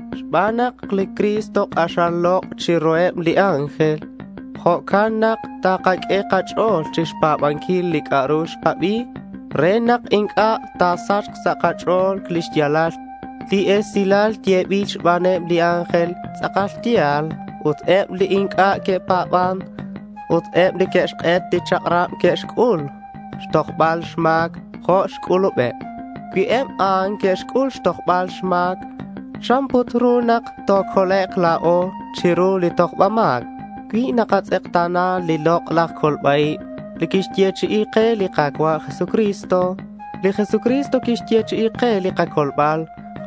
Xban nak li Cristo k'axal lok' chiruheb li ángel, jo'can nak takaq'ue kach'o̱l chixpa̱banquil li c'a'ru xkabi, re nak inc'a' ta̱sachk sa' kach'o̱l lix ya̱lal. Li esilal yebil xbaneb li ángel tz'akal ya̱l ut eb li inc'a' que'pa̱ban ut eb li que'xk'et li chak'rab, que'xc'ul xtojbal xma̱queb jo' xc'ulubeb. Cui eb a'an que'xc'ul xtojbal xma̱c, ¿chan put ru nak tocolek' la̱o chiru li tojba ma̱c cui nakatz'ekta̱na li lok'laj colba-ib li quixyechi'i ke li Ka̱cua' Jesucristo? Li Jesucristo quixyechi'i ke li kacolbal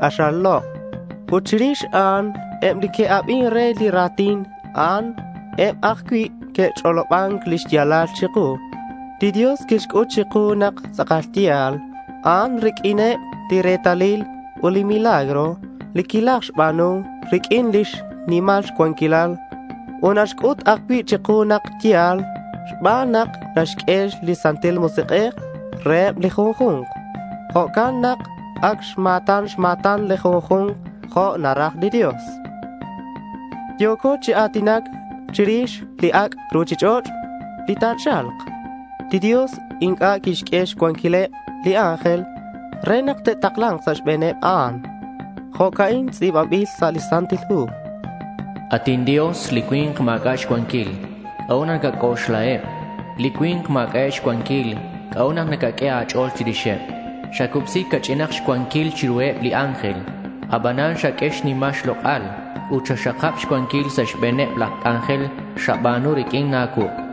k'axal lok'. Ut chirix a'an, eb li que'abin re li ra̱tin, a'an eb ajcui' que'ch'oloban lix ya̱lal chiku. Li Dios quixc'ut chiku nak tz'akal ya̱l a'an riq'uineb li retalil ut li milagro li quilajxba̱nu riq'uin lix nimal xcuanquilal. Ut naxc'ut ajcui' chiku nak ya̱l xban nak naxq'ue li Santil Musik'ej reheb li junju̱nk. Jo'can nak ac xma̱tan xma̱tan li junju̱nk jo' naraj li Dios. Yo̱co chi a̱tinac chirix li ac' ruchich'och' li ta̱cha̱lk. Li Dios inc'a' quixq'ue xcuanquileb li ángel re nak te'takla̱nk sa' xbe̱n a'an. Jo'ca'in tz'i̱banbil sa' li Santil Hu: At inDios, li cui̱nk ma̱c'a' xcuanquil. ¿C'a'ut nak nacac'oxlaheb? Li cui̱nk ma̱c'a'eb xcuanquil. ¿C'a'ut nak nacaq'ue a̱ch'o̱l chirixeb? Xacubsi ca'ch'in xcuanquil chiruheb li ángel. Abanan xaq'ue xnimal xlok'al. Ut xaxakab xcuanquil sa' xbe̱neb la̱ c'anjel xaba̱nu riq'uin a̱cuuk'.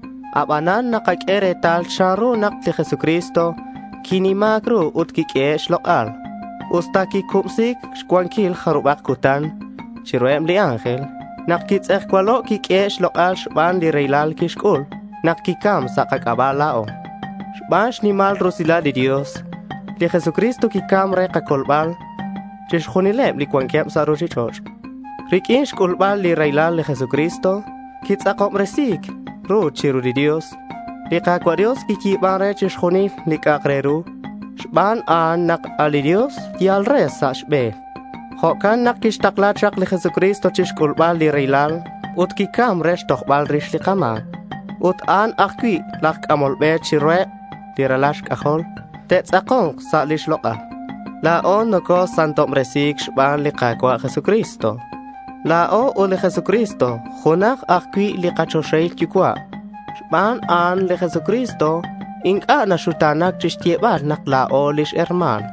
Abanan nakaq'ue retal chanru nak li Jesucristo quinima̱c ru ut quiq'uehe' xlok'al. Usta quicubsi̱c xcuanquil jarubak cutan chiruheb li ángel, nak quitz'ejcualo', quiq'uehe' xlok'al xban li raylal quixc'ul nak quicam sa' kac'aba' la̱o. Xban lix nimal rusilal li Dios, li Jesucristo quicam re xcolbal chixjunileb li cuanqueb sa' ruchich'och'. Riq'uin xc'ulbal li raylal, li Jesucristo quitz'akobresi̱c ru chiru li Dios. Li Ka̱cua' Dios quiyi̱ban re chixjunil li c'a'ak re ru. Xban a'an nak a' li Dios yal re sa' xbe̱n. Jo'can nak quixtakla chak li Jesucristo chi xc'ulbal li raylal ut quicam re xtojbal rix li kama̱c. Ut a'an ajcui' laj c'amol be chiruheb li ralal xc'ajol li te'tz'ako̱nk sa' lix lok'al. La̱o nocosantobresi̱c xban li Ka̱cua' Jesucristo. La̱o ut li Jesucristo junaj ajcui' li kachoxahil Yucua'. Xban a'an li Jesucristo inc'a' naxuta̱na̱c chixyebal nak la̱o lix herma̱n.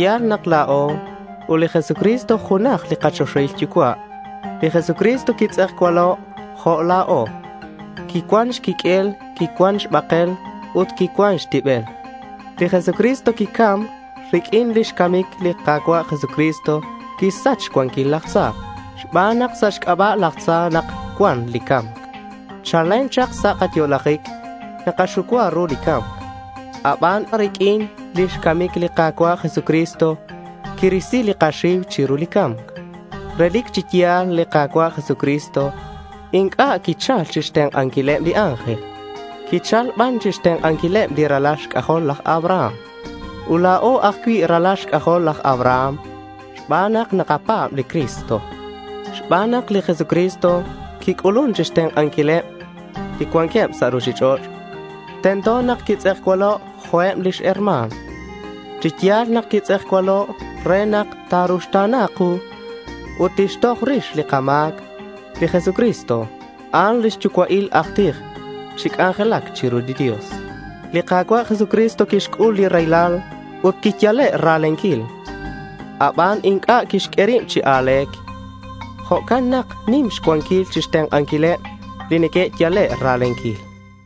Ya̱l nak la̱o ut li Jesucristo junaj li kachoxahil Yucua'. Li Jesucristo quitz'ejcualo' jo' la̱o. Quicuan xquiq'uel. Quicuan xbakel ut xtibel. Li Jesucristo quicam. Riq'uin lix camic, li Ka̱cua' Jesucristo quixsach xcuanquil laj tza, xban nak sa' xc'aba' laj tza nak cuan li ca̱mc. Chalen chak sa' kayo'lajic, nakaxucua ru li ca̱mc. Aban riq'uin lix camic li Ka̱cua' Jesucristo quirisi li kaxiu chiru li ca̱mc. Relic chi ya̱l li Ka̱cua' Jesucristo inc'a' quichal chixtenk'anquileb li ángel. Quichal ban chixtenk'anquileb li ralal xc'ajol laj Abraham. (Ut la̱o ajcui' ralal xc'ajol laj Abraham, xban nak nakapa̱b li Cristo.) Xban nak li Jesucristo quic'ulun chixtenk'anquileb li cuanqueb sa' ruchich'och' tento nak quitz'ejcualo' jo' eb lix herma̱n. Chi ya̱l nak quitz'ejcualo' re nak ta̱ruxta̱na ku ut tixtoj rix li kama̱c. Li Jesucristo a'an lix yucua'il aj tij chi c'anjelac chiru li Dios. Li Ka̱cua' Jesucristo quixc'ul li raylal ut quiyale' ra̱lenquil. Aban, inc'a' quixq'ue rib chi a̱le̱c. Jo'can nak nim xcuanquil chixtenk'anquileb li neque'yale' ra̱lenquil.